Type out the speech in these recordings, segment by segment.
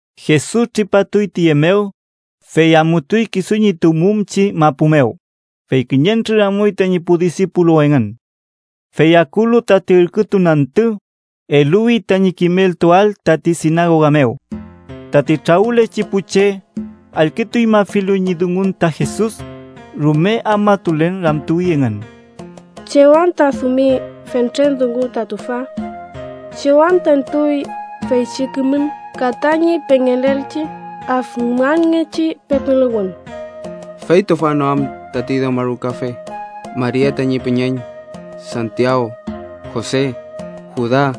Jesus tripatuy tiye mew, fey amutuy kisu ñi tuwmumchi mapu mew, fey kiñentrür amuy tañi pu disipulu engün. Fey akulu tati ürkütun antü, eluwi tañi kimeltuael tati sinagoga mew. Tati trawülechi pu che, allkütuñmafilu ñi dungun ta Jesus, rume afmatulen ramtuwi engün: —¿Chew anta adümi fentren dungu ta tüfa? ¿Chew anta entuy feychi kimün ka tañi pengelelchi afmanngechi pepiluwün? ¿Fey tüfa no am tati dewmarukafe, Maria tañi püñeñ, Santiaw, Jose, Juda,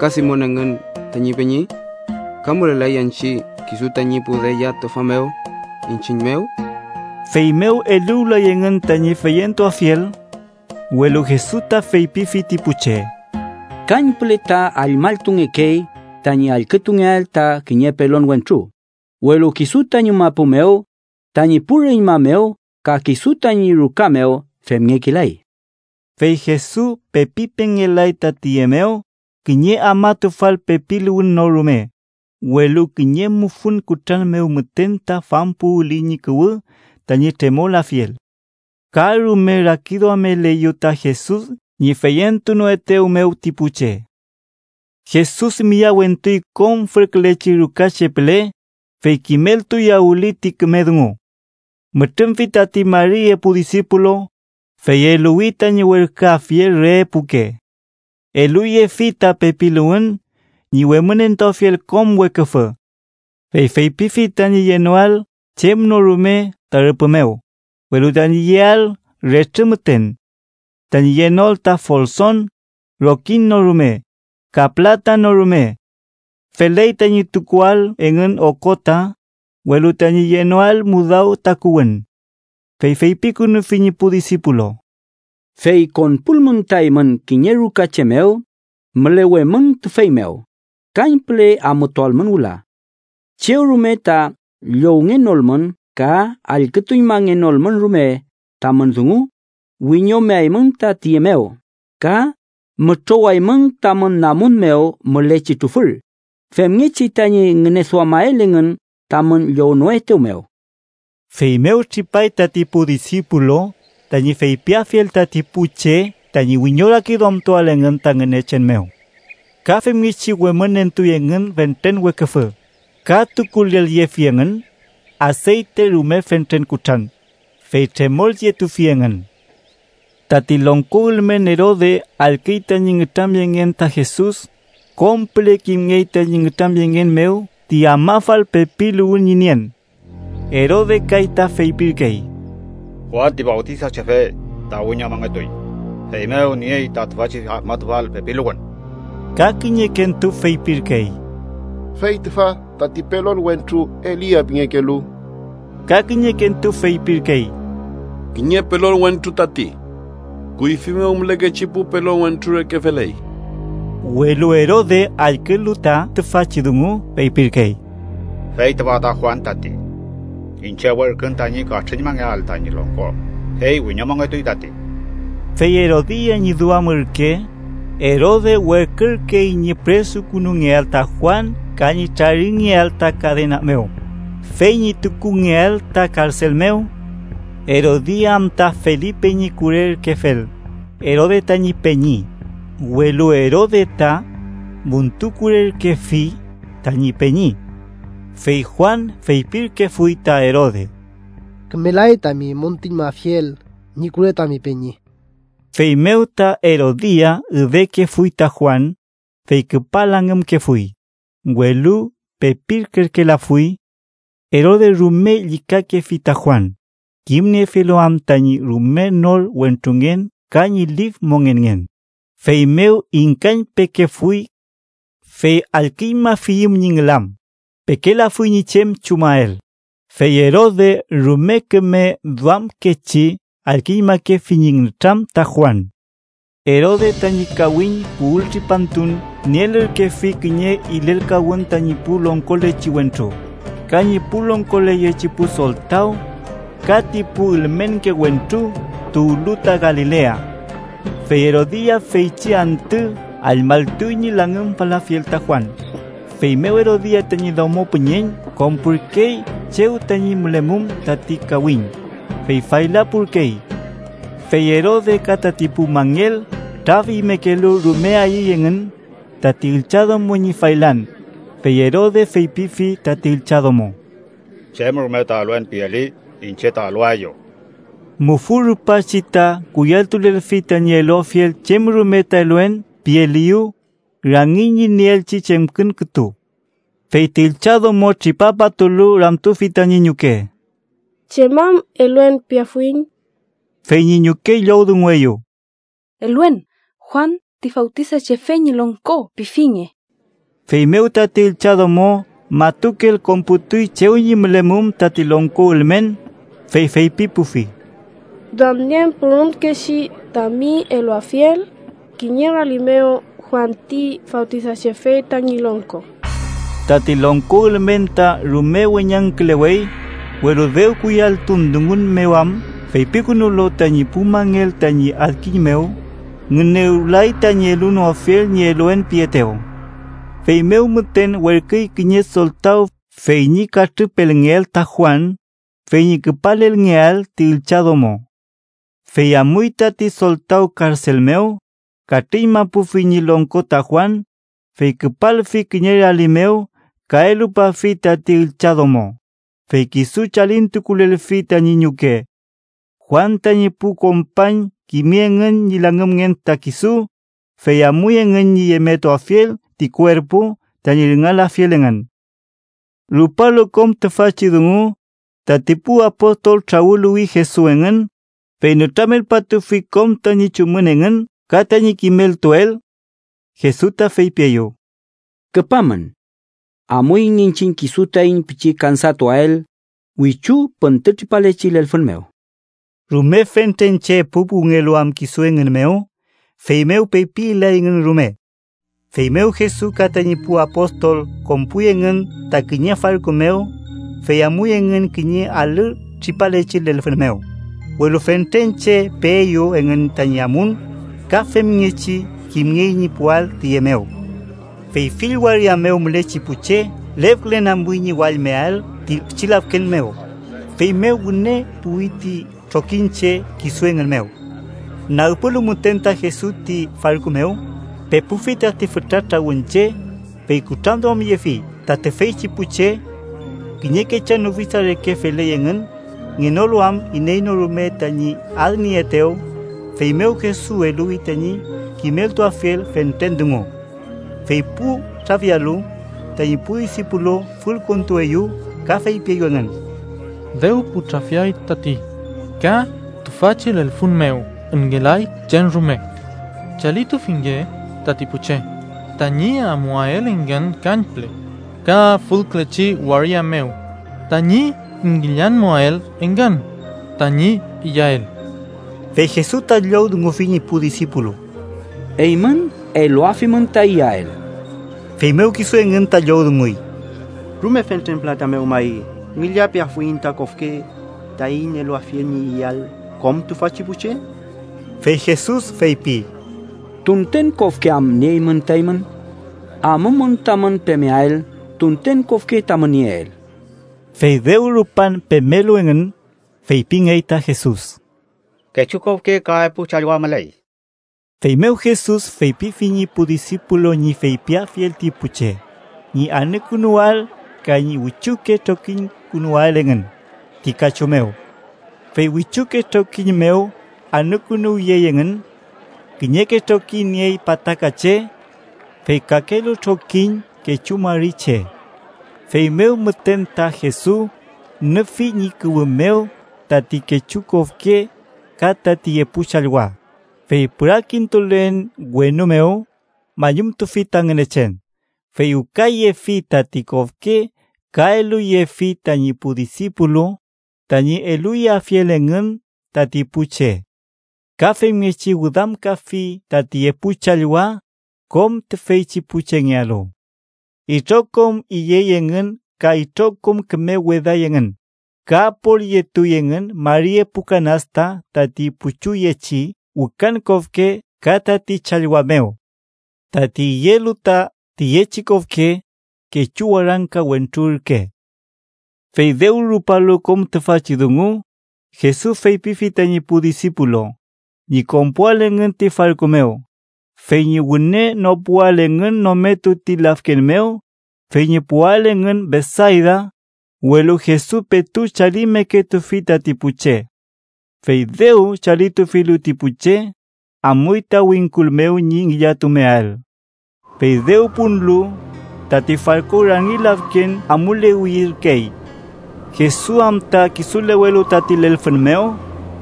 ka Simon engün tañi peñi? ¿Ka mülelay anchi kisu tañi pu deya tüfa mew, iñchiñ mew? Feymew eluwlay engün tañi feyentuafiel. Welu Jesus ta feypifi ti pu che: —Kañpüle ta allmalltungekey tañi allkütungeael ta kiñe pelon wentru, welu kisu tañi mapu mew, tañi pu reñma mew ka kisu tañi ruka mew femngekelay. Fey Jesus pepi pengel-lay ta tiye mew kiñe afmatufal pepiluwün no rume, welu kiñe mufün kutran mew müten ta fampuwüli ñi kuwü tañi tremolafiel. Ka rume rakiduameleyew ta Jesus ñi feyentunoetew mew ti pu che. Jesus miyawentuy kom fülküleyechi rukache püle, fey kimeltuyawüli ti küme dungu. Mütrümfi tati mari epu disipulu, fey eluwi tañi werküafiel re epuke. Eluyefi ta pepiluwün ñi wemünentuafiel kom weküfü. Fey feypifi tañi yenoael chem no rume ta rüpü mew, welu tañi yeael retrü müten. Tañi yenoael ta folson, rokiñ no rume, ka pülata no rume. Feley tañi tukuael engün okota, welu tañi yenoael mudaw takuwün. Fey feypikünufi ñi pu disipulu: —Fey konpulmün ta eymün kiñe ruka che mew, mülewemün tüfey mew, kañpüle amutualmün wüla. Chew rume ta llowngenolmün ka allkütuñmangenolmün rume tamün dungu, wiñomeaymün ta tiye mew ka mütrowaymün tamün namun mew mülechi trufür, femngechi tañi ngüneduamael engün tamün llownoetew mew. Feymew tripay tati pu disipulu tañi feypiafiel tati pu che tañi wiñorakiduamtuael engün ta Ngünechen mew. Ka femngechi wemünentuy engün fentren weküfü, ka tukulelyefi engün aseyte rume fentren kutran, fey tremoyetufi engün. Tati longko ülmen Erode allküy tañi nütramyengen ta Jesus, kom püle kimngey tañi nütramyengen mew ti afmafal pepiluwün ñi nien. Erode kay ta feypirkey: “Juan ti Fawtisachefe ta wiñomongetuy, feymew niey ta tüfachi afmatufal pepiluwün.” Ka kiñekentu feypirkey: “Fey tüfa tati pelon wentru Elia pingekelu.” Ka kiñekentu feypirkey: “Kiñe pelon wentru tati. Kuyfi mew mülekechi pu pelon wentru reke feley.” Welu Erode, allkülu ta tüfachi dungu, feypirkey: “Fey tüfa ta Juan tati. Iñche werkün tañi katrüñmangeael tañi longko, fey wiñomongetuy tati.” Fey Erodia ñi duam ürke, Erode werkürkey ñi püresukünungeael ta Juan ka ñi traringeael ta kadena mew, fey ñi tukungeael ta karsel mew. Erodia am ta Felipe ñi kure ürkefel, Erode tañi peñi, welu Erode ta müntukurerkefi tañi peñi. Fey Juan feypirkefuy ta Erode: “Kümelay tami müntuñmafiel ñi kure tami peñi.” Feymew ta Erodia üdekefuy ta Juan, fey küpa langümkefuy, welu pepilkerkelafuy. Erode rume llükakerkefi ta Juan, kimniefilu am tañi rume nor wentrungen ka ñi lif mongenngen, feymew ingkañpekefuy. Fey allküñmafiyüm ñi ngülam, pekelafuy ñi chem chumael, fey Erode rume küme duamkechi allkütuñmakefi ñi nütram ta Juan. Erode tañi kawiñ puwültripantun nielürkefi kiñe ilelkawün tañi pu longkolechi wentru ka ñi pu longkoleyechi pu soltaw ka ti pu ülmenke wentru tuwlu ta Galilea. Fey Erodia feychi antü allmalltuy ñi langümfalafiel ta Juan. Feymew Erodia tañi domo püñeñ konpurkey chew tañi mülemum tati kawiñ, fey faylapurkey. Fey Erode ka tati pu mangel traf imekelu rume ayüy engün tati üllchadomo ñi faylan, fey Erode feypifi tati üllchadomo: —Chem rume ta ‘eluen’ pieli, iñche ta eluaeyu. Mufü rupachi ta kuyalltulelfi tañi eluafiel chem rume ta “eluen” pielieyew, rangiñ ñi nieelchi chemkün kütu. Fey ti üllchadomo tripapatulu, ramtufi tañi ñuke: —¿Chem am eluen piafuiñ? Fey ñi ñuke llowdungueyew: —‘Eluen Juan ti Fawtisachefe ñi longko’ pifinge. Feymew tati üllchadomo matukel konputuy chew ñi mülemum tati longko ülmen, fey feypipufi: —Duamnien pürümkechi tami eluafiel kiñe rali mew Juan ti Fawtisachefe tañi longko. Tati longko ülmen ta rume weñangkülewey, welu dew kuyalltun dungun mew am feypikünulu tañi pu mangel tañi adkiñ mew, ngünewlay tañi elunoafiel ñi eluen pietew. Feymew müten werküy kiñe soltaw fey ñi katrüpelngeael ta Juan, fey ñi küpalelngeael ti üllchadomo. Fey amuy tati soltaw karsel mew, katrüñmapufi ñi longko ta Juan, fey küpalfi kiñe rali mew ka elupafi tati üllchadomo, fey kisu chalintukulelfi tañi ñuke. Juan tañi pu kompañ kimi engün ñi langümngen ta kisu, fey amuy engün ñi yemetuafiel ti kuerpu, tañi rüngalafiel engün. Rupalu kom tüfachi dungu, tati pu apostol trawüluwi Jesus engün, fey nütramelpatufi kom tañi chumün engün ka tañi kimeltuel. Jesus ta feypieyew: —Küpamün. Amuiñ iñchiñ kisu taiñ pichi kansatuael wichu püntütripalechi lelfün mew. Rume fentren che puwpuwngelu am kisu engün mew, feymew pepi ilayngün rume. Feymew Jesus ka tañi pu apostol konpuy engün ta kiñe farku mew, fey amuy engün kiñe alü tripalechi lelfün mew, welu fentren che peeyew engün tañi amun, ka femngechi kimngey ñi puwael tiye mew. Fey fill waria mew mülechi pu che lefkülen amuy ñi wallmeael ti pichi lafken mew, feymew wüne puwi ti trokiñche kisu engün mew. Nagpulu müten ta Jesus ti farku mew, pepufi tati fütra trawün che, fey kutranduamyefi ta tüfeychi pu che. Kiñe kechan ufisa reke feley engün ngenolu am iney no rume tañi adnieaetew, feymew Jesus eluwi tañi kimeltuafiel fentren dungu. Fey pu trafialu, tañi pu disipulu fülkontueyew ka feypieyew engün: —Dew pu trafiay tati, ka tüfachi lelfün mew ngelay chem rume. Chalitufinge tati pu che, tañi amuael engün kañpüle ka fülkülechi waria mew tañi ngillañmuael engün tañi iyael. Fey Jesus ta llowdungufi ñi pu disipulu: —Eymün eluafimün ta iyael. Feymew kisu engün ta llowdunguy: —¿Rume fentren pülata mew may ngillapeafuiñ ta kofke, taiñ eluafiel ñi iyael kom tüfachi pu che? Fey Jesus feypi: —¿Tunten kofke am nieymün ta eymün? Amumün tamün pemeael tunten kofke tamün nieel. Fey dew rupan pemelu engün, feypingey ta Jesus: —Kechu kofke ka epu challwa müley. Feymew Jesus feypifi ñi pu disipulu ñi feypiafiel ti pu che ñi anükünuwael ka ñi wichuke trokiñkünuwael engün ti kachu mew. Fey wichuke trokiñ mew anükünuwyey engün. Kiñeke trokiñ niey pataka che, fey kakelu trokiñ kechu mari che. Feymew müten ta Jesus nüfi ñi kuwü mew tati kechu kofke ka tati epu challwa, fey pürakintulen wenu mew, mañumtufi ta Ngünechen. Fey wükayefi tati kofke ka eluyefi tañi pu disipulu tañi eluyeafiel engün tati pu che. Ka femngechi wüdamkafi tati epu challwa kom tüfeychi pu chengealu. Itrokom iyey engün ka itrokom küme weday engün, ka apolyetuy engün mari epu kanasta tati puchuyechi wükan kofke ka tati challwa mew. Tati iyelu ta tiyechi kofke, kechu warangka wentru ürke. Fey dew rupalu kom tüfachi dungu, Jesus feypifi tañi pu disipulu ñi konpuael engün ti farku mew, fey ñi wüne nopuael engün nometu ti lafken mew fey ñi puwael engün Betsayda, welu Jesus petu chalimeketufi tati pu che. Fey dew chalitufilu ti pu che, amuy ta wingkul mew ñi ngillatumeael. Fey dew punlu, tati farku rangi lafken amulewiyerkey. Jesus am ta kisulewelu tati lelfün mew,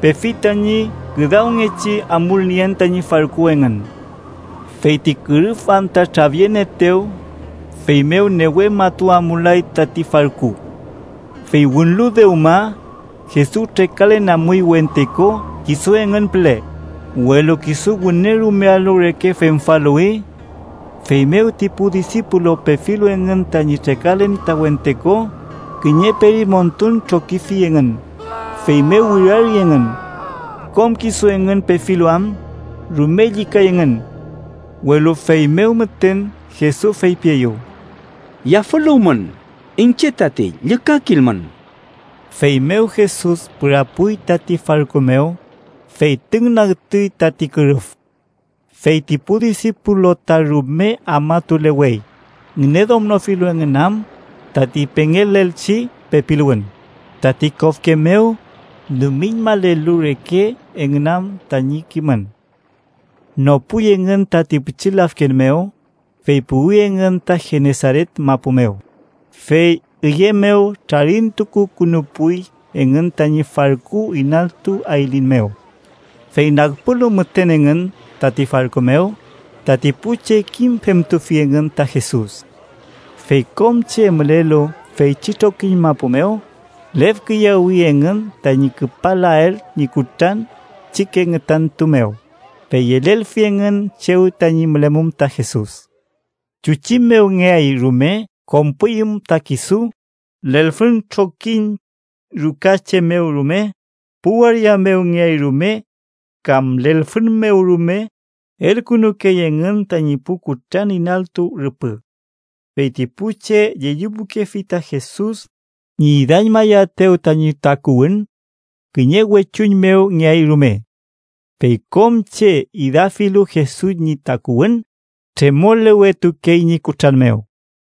pefi tañi küdawngechi amulnien tañi farku engün. Fey ti kürüf am ta trafyenieetew, feymew newe matu amulay tati farku. Fey wünlu dewma, Jesus trekalen amuy wente ko kisu engün püle, welu kisu wüne rumealu reke femfaluwi. Feymew ti pu disipulu pefilu engün tañi trekalen ta wente ko, kiñe perimontun trokifi engün, feymew wirari engün. Kom kisu engün pefilu am, rume llükay engün. Welu feymew müten Jesus feypieyew: —¡Yafüluwmün! Iñche tati. ¡Llükakilmün! Feymew Jesus pürapuy tati farku mew, fey tüngnagtuy tati kürüf. Fey ti pu disipulu ta rume afmatulewey ngüneduamnofilu engün am tati pengelelchi pepiluwün tati kofke mew, dumiñmalelu reke engün am tañi kimün. Nopuy engün tati pichi lafken mew, fey puwi engün ta Genesaret mapu mew, fey üye mew trarintukukünupuy engün tañi farku inaltu ayliñ mew. Fey nagpulu müten engün tati farku mew, tati pu che kimfemtufi engün ta Jesus. Fey kom che mülelu feychi trokiñ mapu mew, lefkiyawi engün tañi küpalael ñi kutran pichike ngütantu mew, fey yelelfi engün chew tañi mülemum ta Jesus. Chuchi mew ngeay rume konpuyüm ta kisu, lelfün trokiñ ruka che mew rume, pu waria mew ngeay rume kam lelfün mew rume, elkünukey engün tañi pu kutran inaltu rüpü. Fey ti pu che llellipukefi ta Jesus ñi idañmayaetew tañi takuwün kiñe wechuñ mew ngeay rume. Fey kom che idafilu Jesus ñi takuwün, tremolewetukey ñi kutran mew.